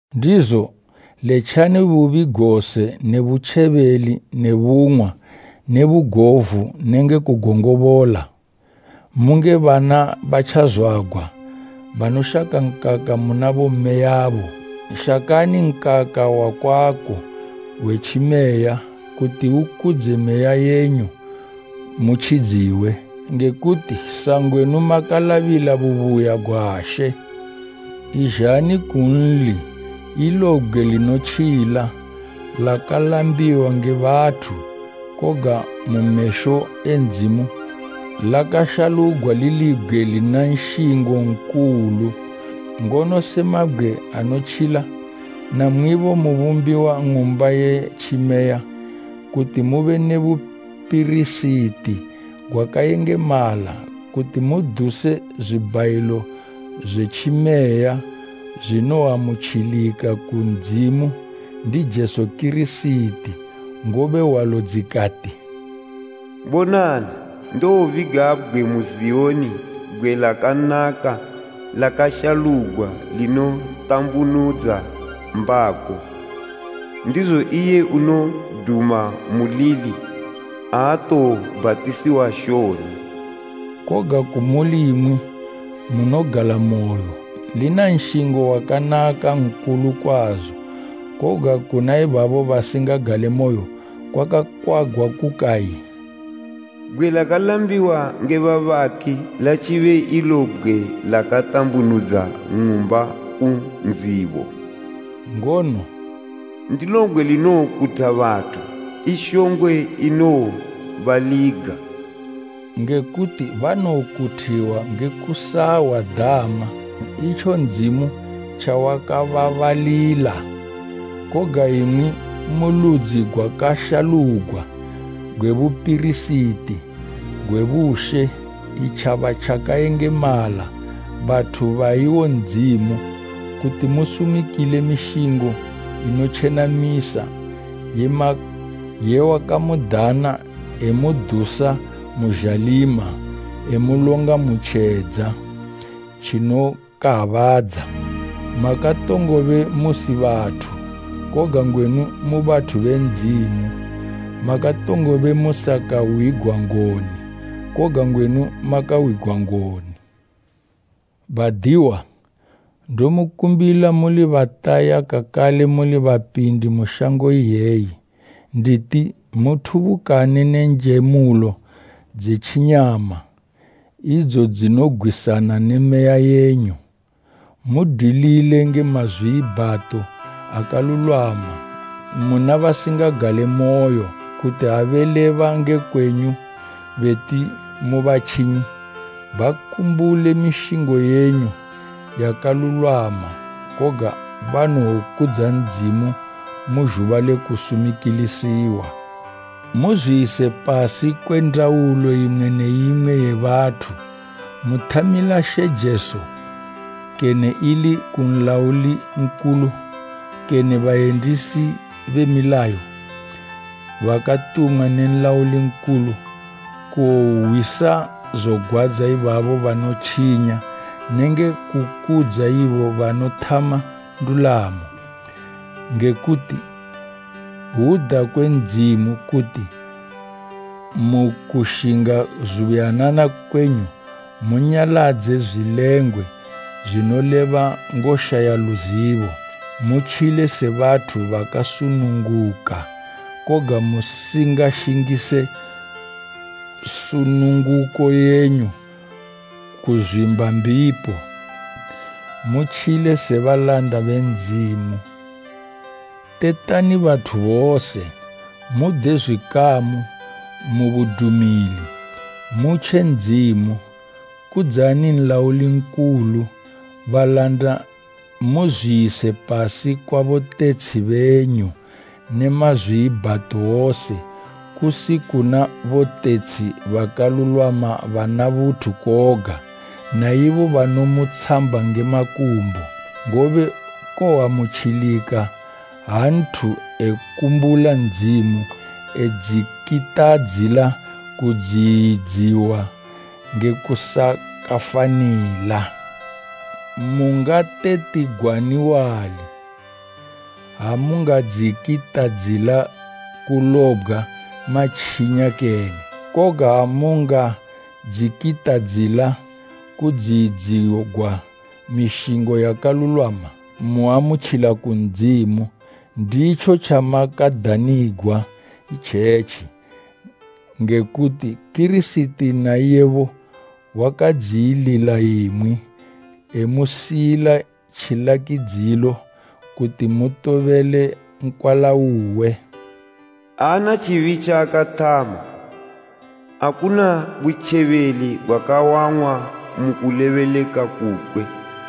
Ndizo, letjani bubi gose ne butjebeli ne bung'wa ne bugovu nenge kugongobola. Munge bana batjazwagwa, banoshaka nkaka muna bommeyabo, shakani nkaka wakwako we tjimeya, kuti ukudze meya yenyu mutjidziwe, nge kuti sangwenu makalabila bubuya gwa She. Izhani kunli, ilo bgwe linotjila, lakalambiwa nge bathu, koga mu mesho e Ndzimu lakashalugwa lili bgwe lina nshingo nkulu. Ngono se mabgwe anotjila namwibo mubumbiwa ng'umba ye tjimeya, kuti mube ne bupirisiti gwakayengemala, kuti muduse zwibhayilo zwe tjimeya zwinoamutjilika ku Ndzimu ndi Jesu Kirisiti. Ngobe hwalo, dzikati “Bonani, ndobiga bgwe mu Ziyoni bgwe lakanaka lakashalugwa linotambunudza mbako. Ndizo iye unoduma mulili aatowobhatisiwa shoni.” Koga kumuli imwi munogalamoyo, lina nshingo wakanaka nkulu kwazo, koga kuna ibabo basingagalemoyo kwakakwagwa kukayi, “Bgwe lakalambiwa nge babaki latjibe ilo bgwe lakatambunudza ng'umba ku ndzibo.” Ngono, “Ndilo bgwe linowokutha bathu, i shongwe inowobaliga.” Nge kuti banokuthiwa nge kusahwa dama, itjo Ndzimu tjawakababalila. Koga imwi mu ludzi gwakashalugwa, gwe bupirisiti gwe bushe, itjaba tjakayengemala, bathu ba iwo Ndzimu, kuti musumikile mishingo inotjenamisa ye wakamudana emudusa mu zhalima, emulonga mu tjedza tjinokabaadza. Makatongobe musi bathu, koga ngwenu mu bathu be Ndzimu. Makatongobe musakahwigwa ngoni, koga ngwenu makahwigwa ngoni. Badiwa, ndomukumbila muli bataya kakale muli bapindi mu shango iyeyi, nditi muthubukane ne njemulo dze tjinyama, idzo dzinogwisana ne meya yenyu. Mudwilile nge mazwiibhato akalulwama muna basingagalemoyo, kuti ha beleba nge kwenyu beti mu batjinyi, bakumbule mishingo yenyu yakalulwama, koga banowokudza Ndzimu mu zhuba le kusumikilisiwa. Muzwiyise pasi kwe ndaulo imwe ne imwe ye bathu, muthamila She Jesu, kene ili ku nlauli nkulu, kene bayendisi be milayo, bakatumwa ne nlauli nkulu kuwohwisa zogwadza ibabo banotjinya nenge kukudza ibo banothama ndulamo. Nge kuti hwuda kwe Ndzimu, kuti mu kushinga zubuyanana kwenyu munyaladze zwilengwe zwinoleba ngoshaya luzibo. Mutjile se bathu bakasununguka, koga musingashingise sununguko yenyu kuzwimba mbipo, mutjile se balanda be Ndzimu. Tetani bathu bose. Mude zwikamu mubudumili. Mutje Ndzimu. Kudzani nlauli nkulu. Balanda muzwiyise pasi kwa botetshi benyu ne mazwiibhato wose, kusi kuna botetshi bakalulwama bana buthu koga, na ibo banomutshamba nge makumbo. Ngobe koamutjilika ha nthu ekumbula Ndzimu e dzikitadzila kudziyidziwa nge kusakafanila. Mungatetigwani wali, ha mungadzikitadzila kulobgwa matjinya kene? Koga ha mungadzikitadzila kudziyidzigwa mishingo yakalulwama, muamutjila ku Ndzimu. Nditjo tjamakadanigwa itjetji, nge kuti Kirisiti na iyebo wakadziyilila imwi, emusiyila tjilakidzilo, kuti mutobele nkwala uwe. “Aana tjibi tjaakathama, akuna butjebeli gwakawang'wa mu kulebeleka kukwe.”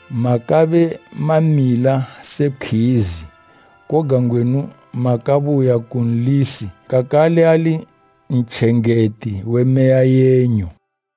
Makabe mamila se pkhwizi, koga ngwenu makabuya ku Nlisi kakale ali Ntjengeti we meya yenyu.